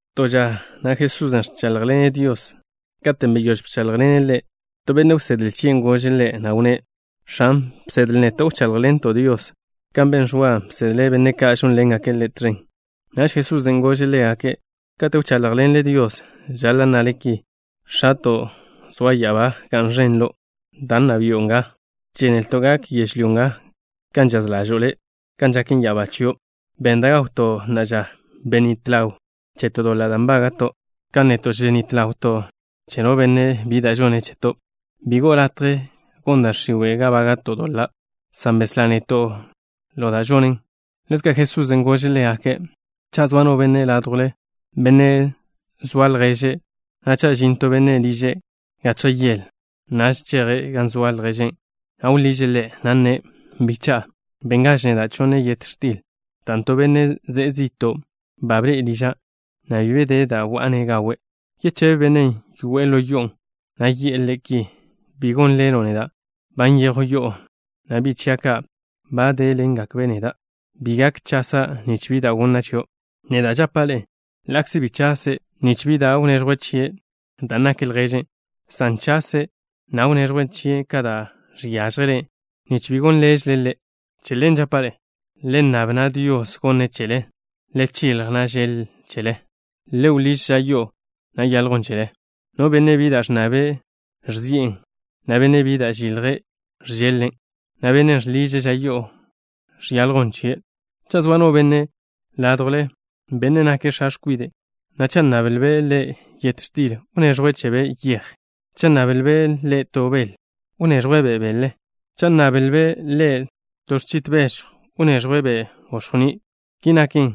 To ža na' Jesusen' ẕcháḻjḻene' Dios. Katen' beyóž bcháḻjḻene' Ḻe', to benne' wsedle chie' gože' Ḻe', na' wnné': —X̱an, bsedle neto' wcháḻjḻento' Dios, kan ben Ẕwa, bsedle' benne' ka' žónḻengake' ḻe' tẕen. Naž Jesusen' gože' ḻégake': —Kate' wcháḻjḻenle Dios, žaḻa' nnale ki: X̱ato', zo' ya'abá, ga'n ẕen lo'. Da, nna bi'o nga. Žénelto' gak yežlyó nga kan žaz ḻažo'o Le', kan žaken ya'abá chio'. Benn da' gawto' na'a ža. Benít ḻaw cheto' doḻan' nbága'to' kan neto' ženít ḻawto' che no benne' bi da' žone' cheto'. Bi go'o latje gon da' x̱iwe' ga bága'to' doḻa', san beslá neto' ḻo da' žonen. Ḻezka' Jesusen' gože' ḻégake': —Cha' zoa no benne' ládjwle, benne' zoa lježe', na' cha' žin to benne' liže' gachje yele, naž cheje' gan zoa lježen', na' wḻiže' ḻe', na' nne': “Bicha'a, benngaž neda' chonne yet x̱til, dan' to benne' ze'e zi'to' ba bḻe'e liža', na' bi be de da' wa'a-ne' gawe'.” ¿Yechebe bennen' yoe'e ḻo yo'on', na' yi'e ḻe' ki? “Bi gon ḻelo' neda'. Ba nyejw yo'o, na' bi' chia' ka' ba déḻengakbe' neda'. Bi gak chasa' nich bi da' gonna' chio'.” Neda' žapa' ḻe'e: ḻa'kze bi chase' nich bi da' wneẕjwe' chie' dan' nake' lježe', san chase', na' wneẕjwe' chie' ka da' žiážjele' nich bi gon ḻelže' ḻe'. Che ḻen žapa' ḻe'e: Le nnab, na' Dios gonne' chele. Le chilj, na' žeḻ chele. Le wḻíž ža yo'o, na' yaḻjwn chele. No benne' bi da' ẕnnabe', ẕzi'en, na' bennen' bi da' žilje', ẕžeḻ-len', na' bennen' žḻiže' ža yo'o, žaljwn chie'. ’Cha' zoa no benne' ládjwle, benne' nake' x̱a x̱kwide', na' cha' nnablbe' ḻe' yet x̱til, ¿wneẕjwe' chebe' yej? Cha' nnablbe' ḻe' to bel, ¿wneẕjwe'-be' bele? Cha' nnablbe' ḻe' to x̱chit bežjw, ¿wneẕjwe'-be' gox̱jní'? Ki naken,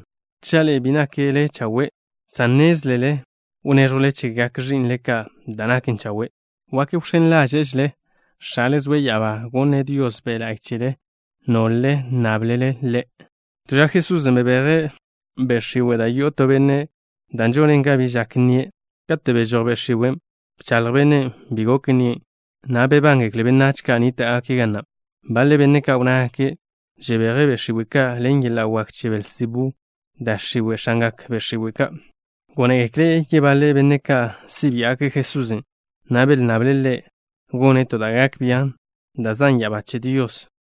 cha' ḻe'e bi nakle chawe', san nnézlele wnéẕjwle chegak ẕi'nle ka' da' naken chawe', wak wx̱én ḻáže'žele X̱ale zoe' ya'abá gonne' Dios Be' La'y chele, nol-le nnáblele Ḻe'. To ža Jesusen' bebeje' be' x̱iwe' da' yo'o to benne', dan' žonen ga bi žak nnie'. Kate' bežój be' x̱iwen', bchaḻj bennen' bi gok nnie', na' bebángekle benách ka' wnníta'gake' ga na'. Baḻe benne' ka' wnnágake': —Žebeje' be' x̱iwe' ka' ḻen yeḻa' wak che Belzebú da' x̱iwe', x̱angak be' x̱iwe' ka'. Gónegekle yebaḻe benne' ka' si' biá'gake' Jesusen', na' belnnable' Ḻe' gone' to da' gak bian' da' zan' ya'abá che Dios.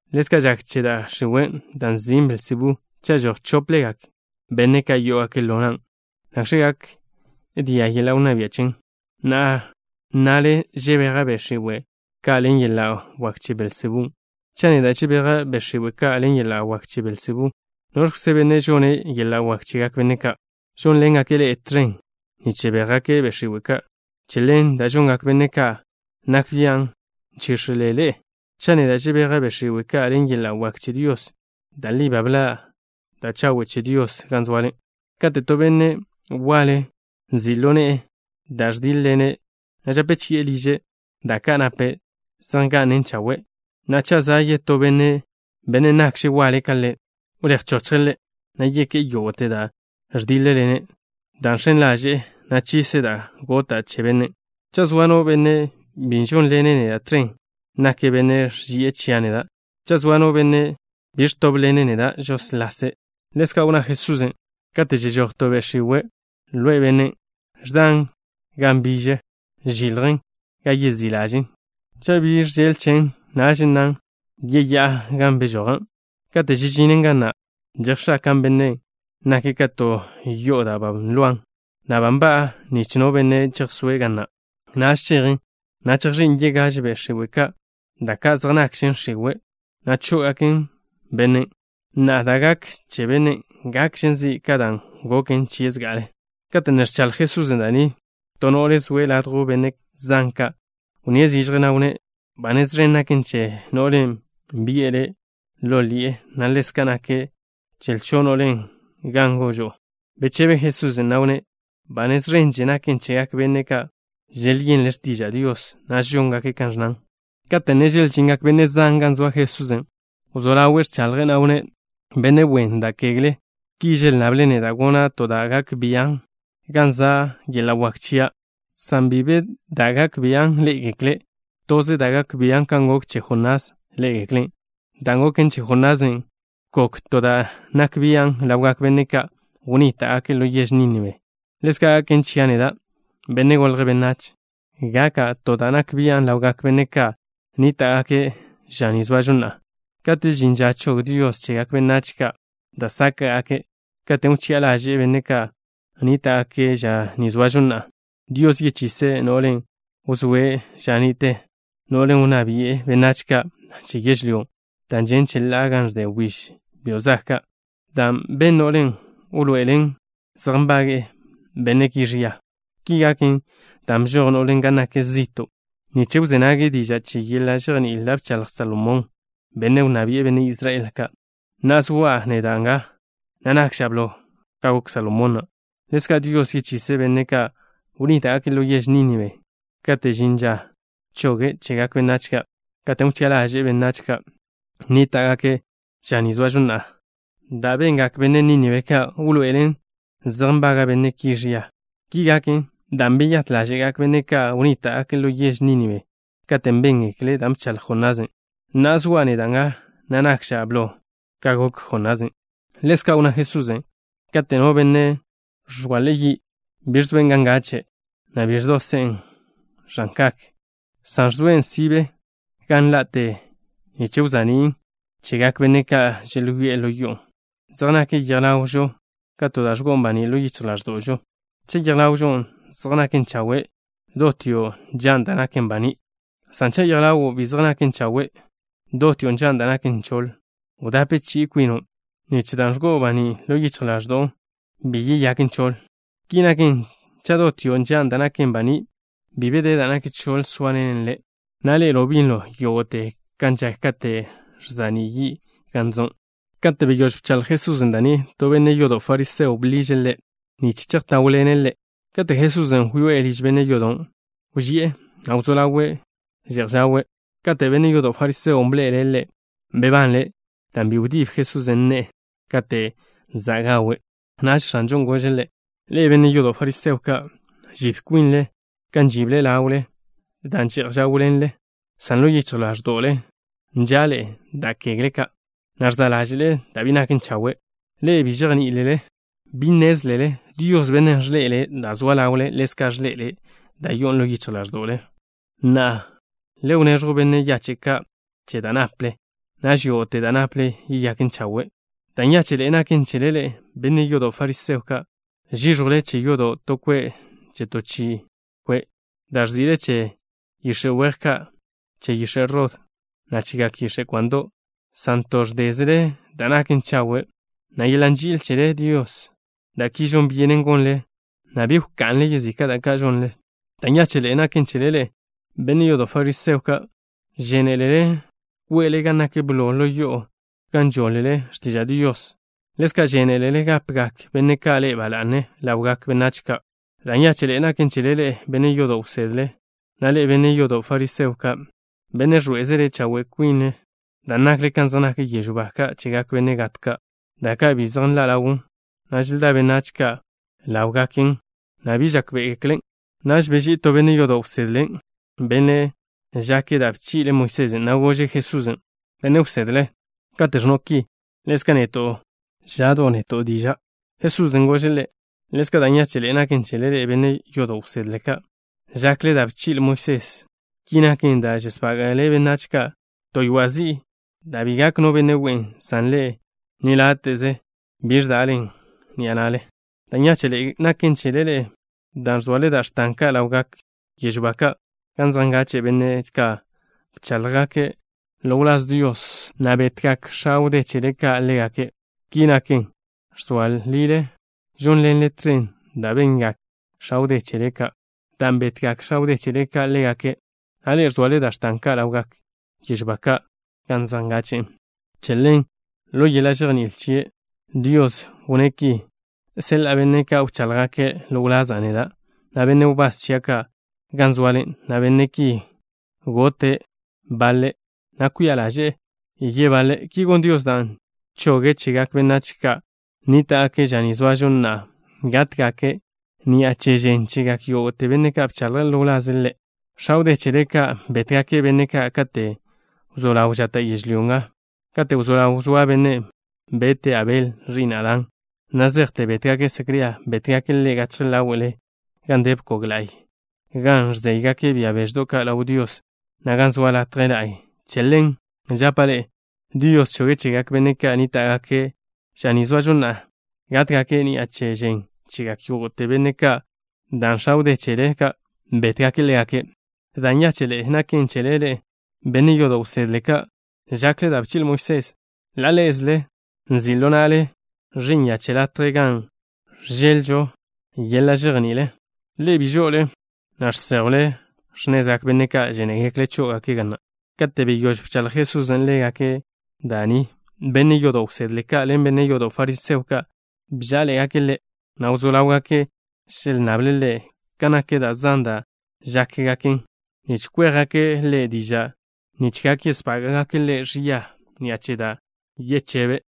Ḻezka' žak che da' x̱iwe', dan' nzin' Belzebú. Cha' žoj chóplegak benne' ka' yó'ogake' ḻo nan', ¿nakx̱ gak dia' yeḻa' wnná bia' chen? ¿Na'a nnale žebeja' be' x̱iwe' ka' ḻen yeḻa' wak che Belzebú? Cha' neda' žebeja' be' x̱iwe' ka' ḻen yeḻa' wak che Belzebú, ¿noẕkze benne' žonne' yeḻa' wak chegak benne' ka' žónḻengake' ḻe'e tẕen, nich žebéjgake' be' x̱iwe' ka'? Che ḻen, da' žongak benne' ka' nak bian' nchíx̱ele ḻe'e. Cha' neda' žebeja' be' x̱iwe' ka' ḻen yeḻa' wak che Dios, da' li ba bḻa' da' ẕnna bia' Dios gan zoale. ’Kate' to benne' waḻe nzi' ḻo ne'e da' ẕdíḻ-ḻene', na' žape chi'e liže', da' ka' nape' zej nga'nen chawe'. Na'a, cha' za' yetó benne', bennen' nakže' waḻe ka ḻe', wléj wchochje' ḻe', na' yeké'e yógo'te da' ẕdíḻ-ḻene', dan' žx̱en ḻaže'en, na' chise' da' gota' che bennen'. ’Cha' zoa no benne' bi žónḻene' neda' tẕen, nake' benne' ẕži'e chia' neda'. Cha' zoa no benne' bi ẕtóbḻene' neda', žóslase'. Ḻezka' wnná Jesusen': —Kate' žežój to be' x̱iwe' ḻo benne', ẕdan gan nbiže, žiljen gan yezí' ḻažen'. Cha' bi žeḻ chen, naž nnan: “Yeyá'a gan bžoja'.” Kate' žežinen ga na', žejx̱akan' bennen', nake' ka to yo'o da' ba nloan, na' ba nba'an nich no benne' chejsóe' ga na'. Naž chejen, na' chejx̱ín' yegáž be' x̱iwe' ka', da' ka' zej nakžen x̱iwe', na' chó'ogaken bennen'. Na'a, da' gaken che bennen' gakžen zi' ka dan' goken chie' zga'ale. Kate' ne ẕchaḻj Jesusen' da' ni, to no'le zoe' ladjw benne' zan ka' wnníe' zižje, na' wnné': —Ba nez ẕen naken che no'len' bi'e Le' ḻo ḻi'e, na' ḻezka' naken che lcho' no'len' gan gožo'o. Bechebe Jesusen', na' wnné': —Ba nez ẕenže naken chegak benne' ka' želyenle' x̱tiža' Dios, na' žóngake' kan ẕnnan. Kate' ne želžingak benne' zan gan zoa Jesusen', wzó ḻawe' ẕchaḻje', na' wnné': —Benne' wen da kegle ki želnnable' neda' gona' to da' gak bian' gan za' yeḻa' wak chia'. San bi be da' gak bian' ḻé'egekle'. Toze da' gak bian' kan gok che Jonás ḻé'egeklen'. Dan' goken che Jonasen' gok to da' nak bian' ḻawgak benne' ka' wnníta'gake' ḻo yež Nínibe. Ḻezka' gaken chia' neda', Benne' Golje' Benách. Gaka' to da' nak bian' ḻawgak benne' ka' nníta'gake' ža ni zoažo na'a. Kate' žin ža chog Dios chegak benách ka' da' sáka'gake', katen' wchi'a ḻaže'e benne' ka' nníta'gake' ža ni zoažo na'a, Dios yechise' no'len' wzóe' ža ni'te, no'len' wnná bi'e benách ka' che yežlyón' da' žen' cheḻá'a gan ẕde wbíž byo' zag ka'. Da' ben no'len' wḻoe'elen zej nbaga' benne' ki ẕia. Ki gaken dan' bžoj no'len' gan nak zi'to' nich wzé nage' diža' che yeḻa' žejní'il da' bchaḻj Salomón, benne' wnná bi'e benne' Israel ka'. Na'a, zoa' neda' nga, na' nakža' blo ka gok Salomón na'. Ḻezka', Dios yechise' benne' ka' wnníta'gake' ḻo yež Nínibe kate' žin ža choge' chegak benách ka', katen' wchi'a ḻaže'e benne' ka' nníta'gake' ža ni zoažo na'a. Da' bengak benne' Nínibe ka' wḻoe'elen zej nbaga' benne' ki ẕia. Ki gaken dan' beyát ḻáže'gak benne' ka' wnníta'gake' ḻo yež Nínibe katen' béngekle' da' bchaḻj Jonasen'. Na'a zoa' neda' nga, na' nakža' blo ka gok Jonasen'. Ḻezka' wnná Jesusen': —Kate' no benne' ẕzalje' yi', bi ẕgo'en gan ngache', na' bi ẕdosen' ẕan kak, san ẕzoen' sibe gan ḻa'ten, nich wza'nín' chegak benne' ka' želyoé'e ḻo yo'on'. Zej nak yej ḻawžo ka to da' ẕgo'on baní' ḻo yichj ḻáẕdo'žo. Cha' yej ḻawo' zej naken chawe', dotio' nžan' da' naken baní'. San cha' yej ḻawo' bi zej naken chawe', dotio' nžan' da' naken choḻ. Wdape chi'i kwino' cha', nich dan' ẕgo'on baní' ḻo yichj ḻaẕdo'o bi yeyaken choḻ. Ki naken, cha' dotio' nžan' da' naken baní', bi be da' naken choḻ zóaḻenen le', na' ḻe'elo' binlo yógo'te, kan žak kate' ẕza'ní' yi' gan zo'. Kate' beyóž bchaḻj Jesusen' da' ni, to benne' yodo' fariseo bḻiže' Ḻe' nich chejtáwḻene' ḻe'. Kate' Jesusen' wyoé'e liž benne' yodon', wži'e, na' wzó ḻawe' že'j žawe'. Kate' benne' yodo' fariseon' bḻe'ele' Ḻe', bebanle' dan' bi wdíb Jesusen' ne'e kate' za' gawe'. Naž X̱anžon' gože' ḻe': —Ḻe'e, benne' yodo' fariseo ka', žib kwinle kan žible ḻawle da' že'j žáwḻenle, san ḻo yichj ḻáẕdo'le nža'le da' kegle ka', na' ẕza' ḻáže'le da' bi naken chawe'. Ḻe'e bi žejní'ilele. ¿Bi nnézlele, Dios, Bennen' ẕḻe'ele' da' zoa ḻawle ḻezka' ẕḻe'ele' da' yo'o ḻo yichj ḻáẕdo'le? Na'a, le wneẕjw benne' yache' ka' che da' naple. Naž yógo'te da' naple yeyaken chawe'. ’Da' nyáche'ḻe'e naken chele ḻe'e, benne' yodo' fariseo ka'. Žíẕjwle che yodo' to kwe' che to chi kwe' da' ẕzi'le che yix̱e' weje, na' che yix̱e' rod, na' chegak yix̱e' kwando', san to ẕdézele da' naken chawe', na' yeḻa' nži'il chele Dios. Da' ki žon byenen gonle, na' bi wka'nle yezika' da ka' žonle. ’Da' nyáche'ḻe'e naken chele ḻe'e, benne' yodo' fariseo ka'. Žénelele kwe'le gan nak blo ḻo yo'o gan žoḻ-le x̱tiža' Dios. Ḻezka' žénelele gápegak benne' ka' ḻe'e ba la'ne ḻawgak benách ka'. ’Da' nyáche'ḻe'e naken chele ḻe'e, benne' yodo' wsedle ka', na' ḻe'e, benne' yodo' fariseo ka', benne' ẕḻoé'ezele chawe' kwinle, dan' nakle kan zej nak yežw ba ka' chegak benne' gat ka', da' ka' bi zej nḻa' ḻawn, na' želdá benách ka' ḻáwlegaken, na' bi žákbe'egeklen'. Naž beží'i to benne' yodo' wsedle, benne' žake' da' bchi'le Moisés, na' gože' Jesusen': —Benne' wsedle, kate' ẕnno' ki, ḻezka' neto' žon zi'o. Jesusen' gože' ḻe': —Ḻezka' da' nyáche'ḻe'e naken chele ḻe'e, benne' yodo' wsedle ka', žakle da' bchi'le Moisés. Ki naken dan' žesbága'le benách ka' to ywa' zi'i da' bi gak no benne' we'en, san ḻe'e ni láte'ze bi ẕdalen' ḻen ni'a na'le. ’Da' nyáche'ḻe'e naken chele ḻe'e, dan' ẕzoale da' x̱tan ka' ḻawgak yežw ba ka' gan zej ngache' benne' ka' bcháḻjgake' ḻo wláz Dios, na' betgak x̱a wdé chele ka' ḻégake'. Ki naken, ẕzoa lile žónḻenle tẕen da' bengak x̱a wdé chele ka', dan' betgak x̱a wdé chele ka' ḻégake', na' ḻe'e ẕzoale da' x̱tan ka' ḻawgak yežw ba ka' gan zej ngache'e. ’Che ḻen, ḻo yeḻa' žejní'il chie', Dios wnné' ki: “Seḻa'a benne' ka' wcháḻjgake' ḻo wlaza' neda', na' benne' wbás chia' ka', gan zoale, na' benne' ki, gotle baḻe', na' kwia ḻáže'le yebaḻe'.” Ki gon Dios dan' choge' chegak benách ka' nníta'gake' ža ni zoažo na'a gátgake' ni'a che žen chegak yógo'te benne' ka' bcháḻjgake' ḻo wlaze' Ḻe'. X̱a wdé chele ka' bétgake' benne' ka' kate' wzó ḻaw žata' yežlyó nga, kate' wzó ḻaw wzóa bennen' bete' Abel, ẕi'n Adán, na' zejte bétgake' Secría. Bétgake' ḻe' gachje ḻáwe'le gan de bkog la'y gan ẕzéygake' bia beždo' ka' ḻaw Dios, na' gan zoa latje la'y. Che ḻen, žapa' ḻe'e, Dios choge' chegak benne' ka' nníta'gake' ža ni zoažo na'a gátgake' ni'a che žen chegak yógo'te benne' ka', dan' x̱a wdé chele ka' bétgake' ḻégake'. ’Da' nyáche'ḻe'e naken chele ḻe'e, benne' yodo' wsedle ka', žakle da' bchi'le Moisés. Ḻa' ḻé'ezele nzi' ḻo na'le ẕi'n ya che latje gan ẕžeḻ-lžo yeḻa' žejní'il. Ḻe'e bi žo'ole, na' žséjwle x̱nezgak benne' ka' žénegekle' chó'ogake' ga na'. Kate' beyóž bchaḻjḻen Jesusen' ḻégake' da' ni, benne' yodo' wsedle ka' ḻen benne' yodo' fariseo ka' bžá'aḻe'egake' Ḻe', na' wzó ḻáwgake' želnnable' Ḻe' kan nak da' zan da' žákgaken, nich kwéjgake' Ḻe' diža' nich gak yesbága'gake' Ḻe' ẕia ni'a che da' yechebe'.